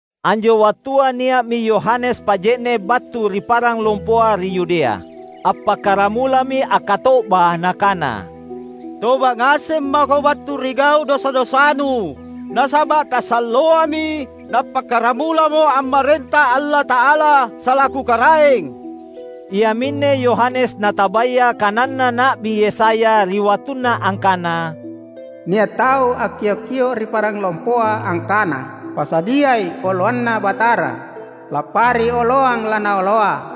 Anjo wattua nia’mi Yohanes Paje’ne’ battu ri parang lompoa ri Yudea. Appakkaramulami akkato’ba nakana, "Toba’ ngaseng mako battu ri gau’ dosa-dosanu, nasaba’ tasalloami nappakkaramulamo ammarenta Allata’ala, salaku Karaeng!" Iaminne Yohanes natabaya kananna Na’bi Yesaya ri wattunna angkana, "Nia’ tau akkiok-kio’ ri parang lompoa angkana, ‘Pasadiai oloanNa Batara; Lappari oloang laNaoloa.’"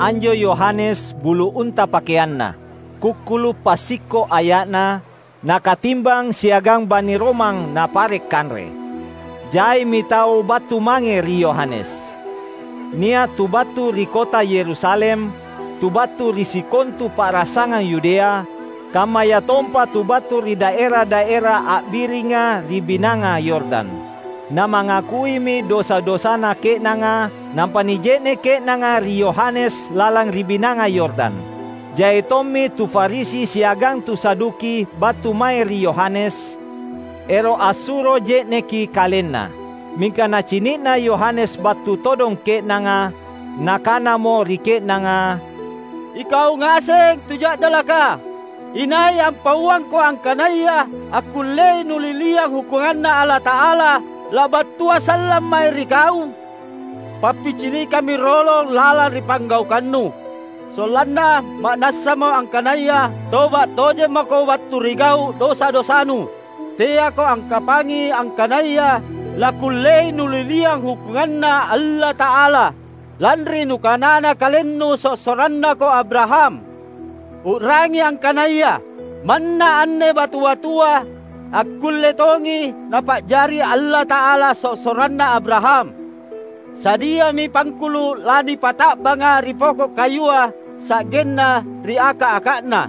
Anjo Yohanes bulu unta pakeanna. Kukkulu’ passikko’ aya’na, na katimbang siagang bani romang napare’ kanre. Jaimi tau battu mange ri Yohanes. Nia’ tu battu ri kota Yerusalem, tu battu ri sikontu pa’rasangang Yudea, kammayatompa tu battu ri daera-daera a’biringa ri Binanga Yordan. Namangakuimi dosa-dosana ke’nanga, nampa nije’ne’ ke’nanga ri Yohanes lalang ri Binanga Yordan. Jai tommi tu Farisi siagang tu Saduki battu mae ri Yohanes, ero’ assuro je’neki kalenna. Mingka nacini’na Yohanes battu todong ke’nanga, nakanamo ri ke’nanga, "Ikau ngaseng tu ja’dalaka! Inai ampauangko angkanaya akkullei nuliliang hukkunganNa Allata’ala, labattua sallang mae ri kau? Pappicinikammi rolong lalang ri panggaukannu, sollanna ma’nassamo angkanaya toba’ tojeng mako battu ri gau’ dosa-dosanu. Teako akkapangi angkanaya lakkullei nuliliang hukkunganNa Allata’ala lanri nukanana kalennu sossorannako Abraham. U’rangi angkanaya, manna anne batu-batua, akkulle tongi Napa’jari Allata’ala sossoranna Abraham! Sadiami pangkulu’ lanipata’banga ri poko’ kayua sa’genna ri aka’-aka’na.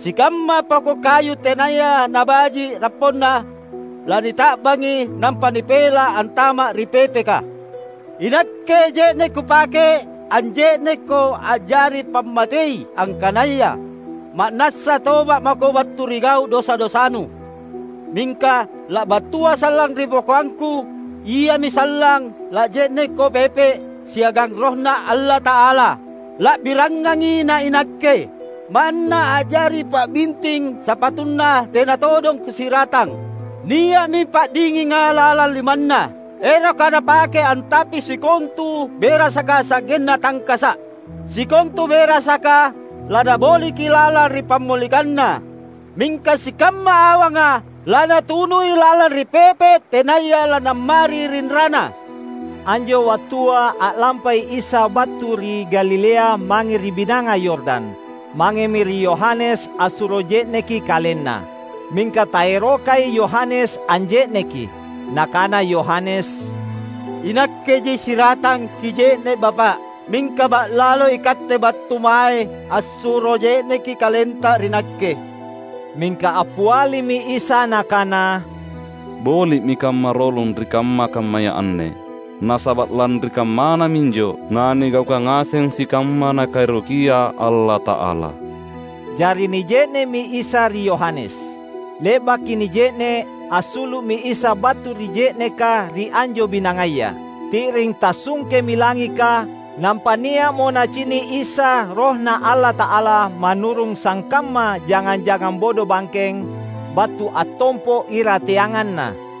Sikamma poko’ kayu tenaya nabaji’ rapponna lanita’bangi nampa nipela’ antama’ ri pepeka. Inakke je’ne’ kupake anje’nekko a’jari pammatei angkanaya ma’nassa toba’ mako battu ri gau’ dosa-dosanu; mingka labattua sallang ri bokoangangku, iami sallang lanje’nekko pepe’ siagang RohNa Allata’ala. La’birangangi nainakke. Manna a’jari pabinting sapatuNa tena todong kusiratang. Nia’mi pa’dinginga lalang limanNa, eroka Napake antapi sikontu berasaka sa’genna tangkasa’. Sikontu berasaka laNaboliki lalang ri pammolikanna, mingka sikamma awanga laNatunui lalang ri pepe’ tenaya nalammari rinrana." Anjo wattua a’lampai Isa battu ri Galilea mange ri Binanga Yordan. Mangemi ri Yohanes assuro je’neki KalenNa. Mingka taerokai Yohanes anje’neki. Nakana Yohanes, "Inakkeji siratang Kije’ne’ Bapa’. Mingka ba’lalo iKatte battu mae assuro je’neki KalenTa ri nakke." Mingka appialimi Isa Nakana, "Boli’mi kamma rolong ri kamma-kammaya anne. Nasaba’ lanri kammana minjo nanigaukang ngaseng sikamma Nakaerokia Allata’ala." Jari nije’ne’mi Isa ri Yohanes. Le’baki nije’ne’, assulu’mi Isa battu ri je’neka ri anjo binangaya. Ti’ring tassungkemi langika, nampa nia’mo Nacini’ Isa RohNa Allata’ala manurung sangkamma jangang-jangang bodobangkeng, battu attompo’ irateanganNa.